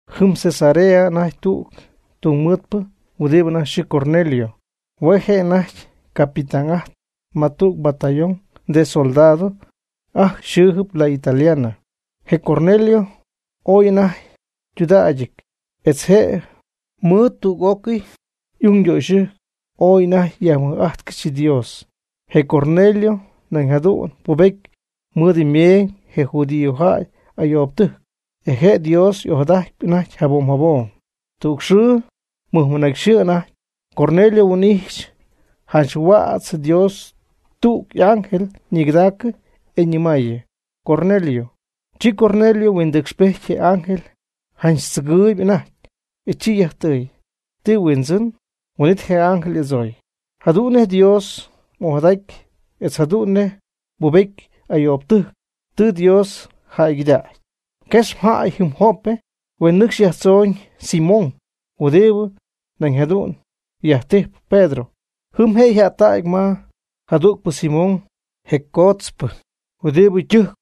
Jɨm Cesarea anajty tüg tungmɨɨdpɨ huɨdi anajty yxɨɨ Cornelio, hue' je' anajty capitán'ajtp ma tüg batallón soldado ajcxy yxɨɨjɨp, la Italiana. Je Cornelio ooy anajty ytudägyɨty, etz je' mɨɨd tüg'ócɨy y'ung ytöxyɨjc ooy anajty yajmɨj'ajtcɨxy Dios. Je Cornelio nañ jadu'n ypubety mɨɨd meeñ je judíojäy ayoobtɨjc, e je' Dios ojadajt anajty jabom jabom. Tüg xɨɨ, mɨnacyxɨɨ anajty, Cornelio huin'ijxy janch huädz Dios tüg y'ángel ñigɨdaacɨ, e ñɨmaayɨ: ―¡Cornelio! Chi Cornelio huindɨcxpejty je ángel janch tzɨgɨɨyb anajty, e chi yajtɨɨy: ―¿Ti Huindzɨn? Huin'it je ángel y'adzooy: ―Jadu'n nej mDios'ojadaty etz jadu'n nej mbubety ayoobtɨjc tɨ Dios jäygɨdägy. Quex mjäy jɨm Jope, huen nɨcxy yajtzoñ Simón, huɨdibɨ nañ jadu'n yajtijp Pedro. Jɨm je' yja'ttacy ma jadügpɨ Simón, je cootzpɨ huɨdi ytɨjc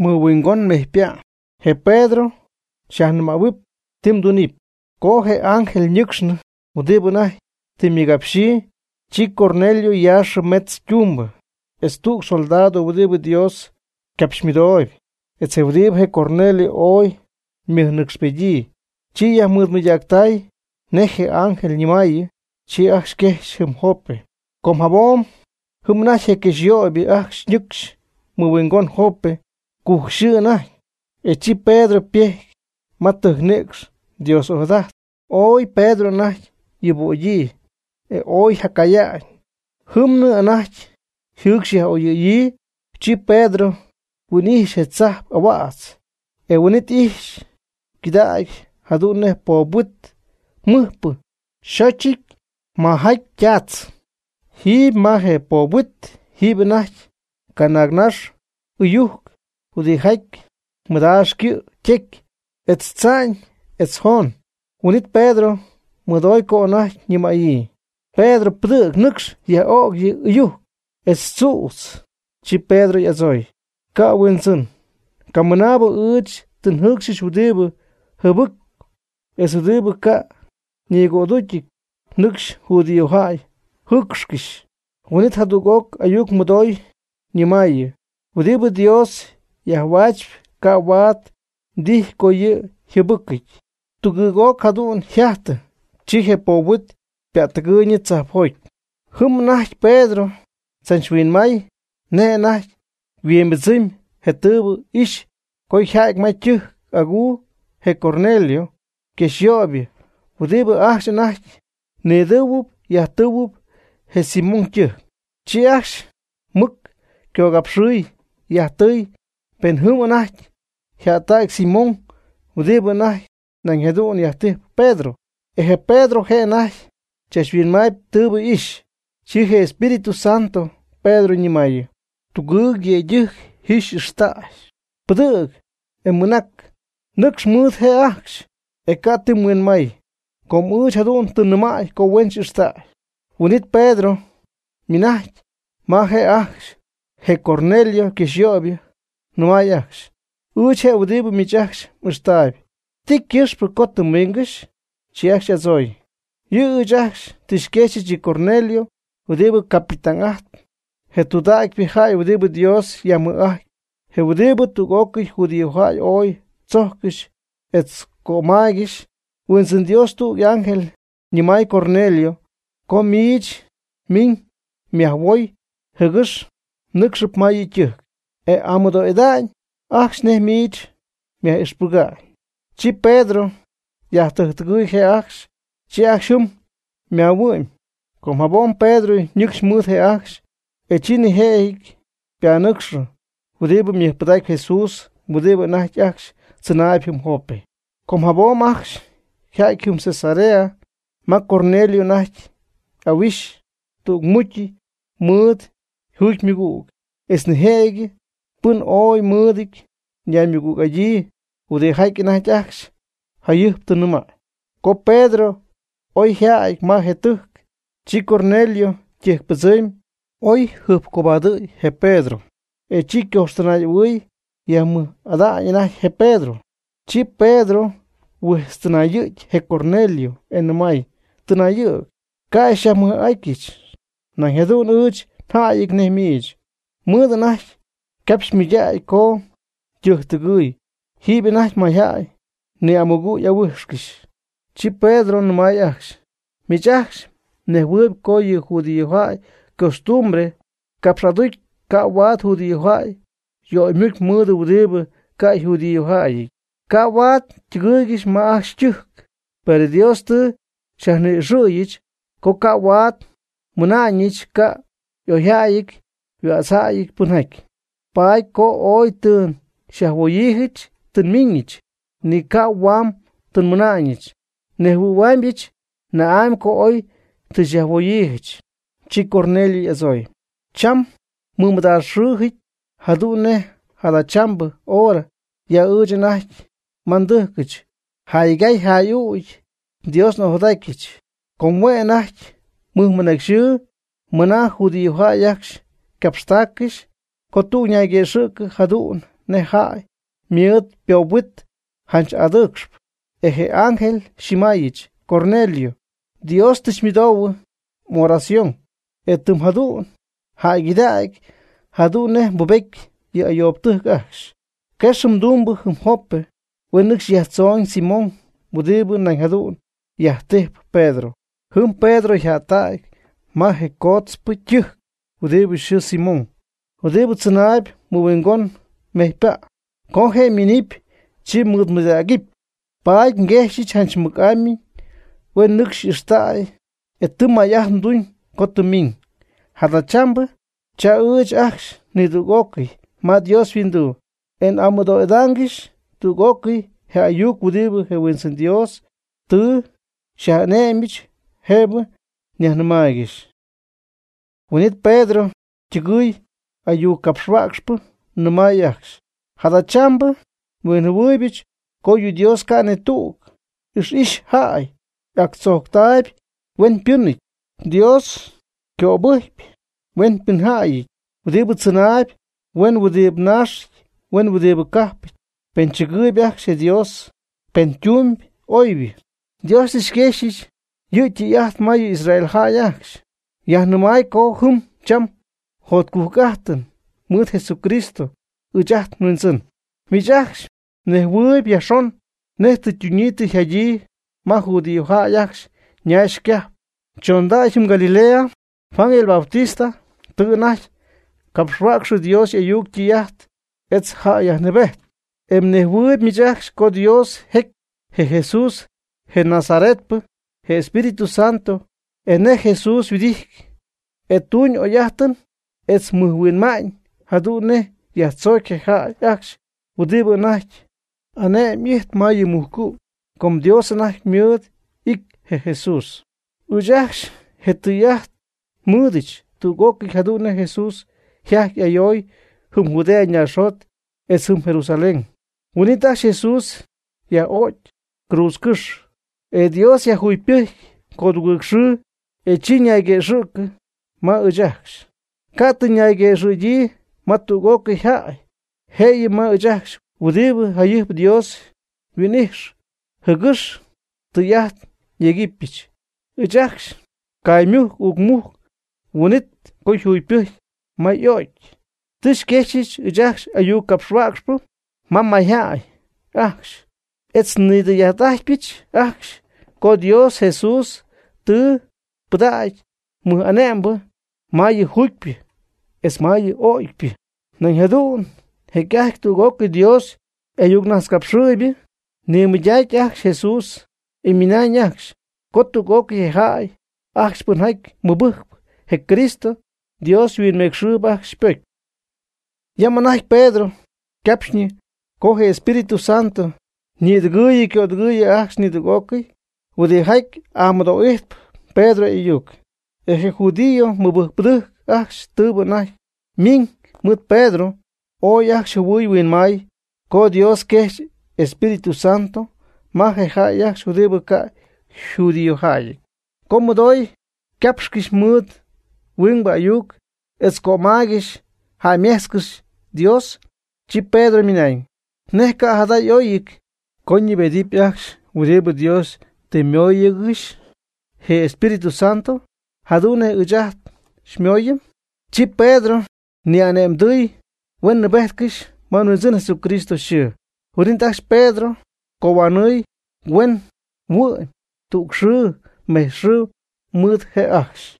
mɨhuingon mejypa'. Je Pedro xyajnɨmähuɨpy ti mdunɨpy. Co je ángel ñɨcxnɨ huɨdi anajty tɨ ymɨgapxyii, chi Cornelio yaaxɨ mejtz ytumbɨ, etz tüg soldado huɨdi Dios capxymɨdoob, etz huɨdibɨ je Cornelio ooy ymɨjnɨcxpedyii. Chi yajmɨɨdmɨydactay nej je ángel ñɨmaayɨ, chi ajcxy quejxy jɨm Jope. Com jabom jɨm anajty je quejxyöybɨ ajcxy ñɨcxy mɨhuingon Jope, cujc yxɨɨ anajty, e chi Pedro ypejty ma tɨjcnïcx Dios ojadajtp. Ooy Pedro anajty yuubögyii, e ooy jacaya'ñ, jɨmnɨ anajty yjɨɨcxy yaj'oyɨ̈yii. Chi Pedro huin'ixy je tzajp ahuädz, e huin'it ijxy quidägy jadu'n nej poob huit mɨjpɨ yxóchɨty majaty ytaatz. Jiiby ma je poob huit, jiiby anajty canaagnax ɨyujc huɨdijaty mɨdaax ycɨ' ytecy etz tza'ñ etz joon. Huin'it Pedro mɨdoy co anajty ñɨmäyii: ―Pedro, pɨdɨ̈g nɨcxy yaj'ög yɨ ɨyujc etz tzüdz. Chi Pedro y'adzooy: ―Ca', Huindzɨn, camɨnaabɨ ɨɨch tɨ njɨcxy huɨdibɨ jɨbɨ́cɨp etz huɨdibɨ ca' ñigödúcyɨty nɨcxy judíojäy jɨɨcxcɨxy. Huin'it jadüg'oc ayuc mɨdoy ñɨmäyii: ―Huɨdibɨ Dios yajhuäch ca' huaad mdijy co yɨ' yjɨbɨcɨty. Tugɨɨg'oc jadu'n yjajtɨ, chi je poob huit ypättɨgɨɨyñɨ tzajpjoty. Jɨm anajty Pedro tzachhuinmay nej anajty yhuimbɨdzɨmy je tɨɨbɨ ixy co yja'ty ma tɨjc aguu je Cornelio yquexyöybɨ huɨdi ajcxy anajty nidɨɨhuɨp yajtɨɨhuɨp je Simón ytɨjc. Chi ajcxy mɨc ycogapxɨɨy yajtɨɨy pen jɨm anajty yjättägy Simón huɨdibɨ anajty nañ jadu'n yajtijp Pedro. E je Pedro je' anajty chachhuinmaayb tɨɨbɨ ixy, chi je Espíritu Santo Pedro ñɨmaayɨ: ―Tugɨɨg yëydɨjc ji xy'ixtäy. Pɨdɨ̈g e mɨnac, nɨcx mɨɨd je' ajcxy, e ca' ti mhuinmay, com ɨɨch jadu'n tɨ nnɨmäy co huen xy'ixtäy. Huin'it Pedro ymɨnajcy ma je' ajcxy, je Cornelio quexyöybɨ, nɨmay ajcxy: ―Ɨɨch je' huɨdibɨ miich ajcxy m'ixtaayb, ¿ti ycɨxpɨ co tɨ mmiingɨxy? Chi ajcxy y'adzooy: ―Yɨ' ɨɨch ajcxy tɨ xyquexyɨch yɨ Cornelio huɨdibɨ capitán'ajtpɨ, je' tudägy jäy huɨdibɨ Dios yajmɨj'ajtp, je huɨdibɨ tüg'ócɨy judíojäy ooy tzójccɨxy, etz cömaaygɨxy. Huindzɨn Dios tüg y'ángel ñɨmay Cornelio co miich miiñ nyajhuoy, jɨgɨx mnɨ́cxɨp ma yɨ' ytɨjc, e y'amɨdo'ida'ñ ajcxy nej miich myaj'ixpɨga'ñ. Chi Pedro yajtɨjctɨgɨɨy je' ajcxy. Chi ajcxy jɨm ymaahuɨ'my. Com jabom Pedro ñɨcxy mɨɨd je' ajcxy, e chi nijëjɨty ypanɨcxɨ huɨdibɨ mɨjpɨdacp Jesús huɨdi anajty ajcxy tzɨnaayb jɨm Jope. Com jabom ajcxy yja'ty jɨm Cesarea ma Cornelio anajty y'ahuixy tügmucy mɨɨd yjugymɨgüg, etz nijëjɨty pɨn ooy mɨɨd ñaymɨgüg'adyii, huɨdijaty anajty ajcxy jayɨjp tɨ nɨmäy. Co Pedro oyjäty ma je tɨjc, chi Cornelio ytɨjcpɨdzɨmy oy yjɨjpcobadɨ̈y je Pedro, e chi ycoxtɨnay'ahuɨɨy yajmɨj'ada'ñ anajty je Pedro. Chi Pedro huijtztɨnayɨ̈gy je Cornelio, e nɨmay: ―Tɨnayɨ̈g, ca' xyajmɨj'ida'ñɨch, nañ jadu'n ɨɨch njäyɨty nej miich. Mɨɨd anajty ycapxy ymɨydägy co ytɨjctɨgɨy, jiiby anajty mayjäy ni'amugɨ̈'ahuijxcɨxy. Chi Pedro nɨmay ajcxy: ―Miich ajcxy mnejhuɨɨyb co yɨ judíojäy ycostumbre capx'aducy ca' huaad judíojäy yöymucy mɨɨd huɨdibɨ ca' yjudíojäyɨty, ca' huaad ytɨgɨɨygɨxy ma ajcxy ytɨjc. Per Dios tɨ xyajni'ixɨ̈yɨch co ca' huaad nmɨna'ñɨch ca' oyjäyɨty huädzjäyɨty pɨnjaty. Paady co oy tɨ xyajhuoyiijɨch tɨ nmiiñɨch, ni ca' huam tɨ nmɨna'ñɨch. Nnejhuɨ̈huaamyɨch na'amy co oy tɨ xyajhuoyiijɨch. Chi Cornelio y'adzooy: ―Cham ymɨmɨdaaxxɨɨjɨ̈y, jadu'n nej jadachambɨ hora, ya ɨɨch anajty ma ndɨjcɨch, jaygay jay'ügy nDios'ojadatyɨch. Com hue' anajty mɨjmɨnacy xɨɨ mɨna judíojäy ajcxy ycapxtaaccɨxy, co tüg ñayguëxɨ̈cɨ jadu'n nej jäy mɨɨd ypoob huit janch adɨɨcxp. E je ángel xyñɨmaayɨch: “Cornelio, Dios tɨ xymɨdoohuɨ m'oración e tɨ jadu'n jäygɨdägy jadu'n nej mbubety yɨ ayoobtɨjc ajcxy. Quex mdumbɨ jɨm Jope, huen nɨcxy yajtzoñ Simón huɨdi nañ jadu'n yajtijp Pedro. Jɨm Pedro yja'ttägy ma je cotzpɨ ytɨjc huɨdibɨ yxɨɨ Simón, huɨdibɨ tzɨnaayb mɨhuingon mejypa'. Co je' ymiinɨpy, chi xymɨɨdmɨydägɨpy.” Paady nguejxyɨch janch mɨc'amy huen nɨcxy xy'ijxtäy. E tɨ may'ajt mduñ co tɨ mmiiñ. Jadachambɨ cha ɨɨch ajcxy nidüg'ócɨy ma Dios yhuinduu. E n'amɨdo'idáangɨxyɨch tüg'ócɨy je y'ayuc huɨdibɨ je Huindzɨn Dios tɨ xyaj'ane'my jëbɨ xyajnɨmaaygɨxy. Huin'it Pedro ytɨgɨɨy y'ayuccapxhuäcxpɨ, nɨmay ajcxy: ―Jadachambɨ huinjɨhuɨɨybɨch, co yɨ Dios ca' ni tüg ixy'ixy jäy, y'actzojctaayb hueñypɨ́nɨty. Dios ycöbɨjcpy hueñypɨnjäyɨty huɨdibɨ tzɨnaayb huen huɨdibɨ naax huen huɨdibɨ cajpɨty, pen chɨgɨɨyb ajcxy Dios, pen tumyb oybɨ. Dios tɨ quexy yɨ' ytɨy'ajt ma yɨ Israel jäy ajcxy, yajnɨmay co ji cham jotcujc'ájtɨn mɨɨd Jesucristo ɨɨch ajt nHuindzɨn. Miich ajcxy mnejhuɨɨyb yajxon nej tɨ ytunyii tɨ yjadyii ma judíojäy ajcxy ñaax ycajp chondacy jɨm Galilea, Juan el Bautista tɨ anajty capxhuäcxɨ Dios y'ayuc ytɨy'ajt etz yjäyyajnɨɨbety. E mnejhuɨɨyb miich ajcxy co Dios yejc je Jesús je Nazaretpɨ je Espíritu Santo, e nej Jesús yhuɨdijty e tuuñ oy'ájtɨn, etz mɨjhuinma'ñ, jadu'n nej yajtzocy je jäy ajcxy huɨdi anajty ane'm'ijtp ma yɨ mujcu'. Com Dios anajty mɨɨd y'ity je Jesús. Ɨɨch ajcxy je tɨy'ajt nmɨɨdɨch tüg'ócɨy jadu'n nej Jesús yjajty y'ayoy jɨm Judea naaxjot etz jɨm Jerusalén. Huin'it ajcxy Jesús yaj'o'cy cruudzcɨ́xy. E Dios yajjugypɨjcy codugɨɨg xɨɨ, e chi yajnayguëxɨ̈cɨ ma ɨɨch ajcxy. Ca' tɨ yajnayguëxɨ̈gyii ma tüg'ócɨy jäy, jëyɨ ma ɨɨch ajcxy huɨdi jayɨjp Dios yhuin'ijx jɨgɨx tɨy'ajt nyegɨpyɨch. Ɨɨch ajcxy caaymujc uucmujc huin'it co yjugypɨjcy ma y'o'cy. Tɨ xyquexy ɨɨch ajcxy ayuc ngapxhuäcxpɨ ma mayjäy ajcxy etz nidɨy'ajt'adɨpyɨch ajcxy co Dios Jesús tɨ pɨdägy mɨj'ane'mbɨ ma yɨ juugypɨ etz ma yɨ ögypɨ. Nañ jadu'n jecy'ajty tüg'ócɨy Dios y'ayucnajtzcapxɨɨybɨ ñimɨydac ajcxy Jesús, e ymɨnañ ajcxy co tüg'ócɨy je jäy ajcxy pɨnjaty mɨbɨjc je Cristo, Dios huinmecxɨɨb ajcxy ypocy. Yam anajty Pedro ycapxyñɨ co je Espíritu Santo ñïdɨgɨɨyɨ ycödɨgɨɨyɨ ajcxy nidüg'ócɨy huɨdijaty y'amɨdo'ijt Pedro y'ayuc. E je judío mɨbɨjcpɨdɨjc ajcxy tɨɨbɨ anajty miiñ mɨɨd Pedro, ooy ajcxy jɨhuɨy huinmay co Dios quejx Espíritu Santo ma je jäy ajcxy huɨdibɨ ca' yjudíojäyɨty, co mɨdoy ycapxcɨxy mɨɨd huingbɨ ayuc, etz cömaygɨxy jäymejtzcɨxy Dios. Chi Pedro ymɨnañ: ―¿Nej ca' jada' y'óyɨty co ñɨɨbedɨpy ajcxy huɨdibɨ Dios tɨ ymóoyɨgɨxy je yEspíritu Santo jadu'n nej ɨɨch ajt xymooyɨm? Chi Pedro ni'ane'mdɨɨy huen nɨɨbejtcɨxy ma Huindzɨn Jesucristo yxɨɨ. Huin'it ajcxy Pedro cohuanɨɨy huen huɨ'my tüg xɨɨ mejtz xɨɨ mɨɨd je' ajcxy.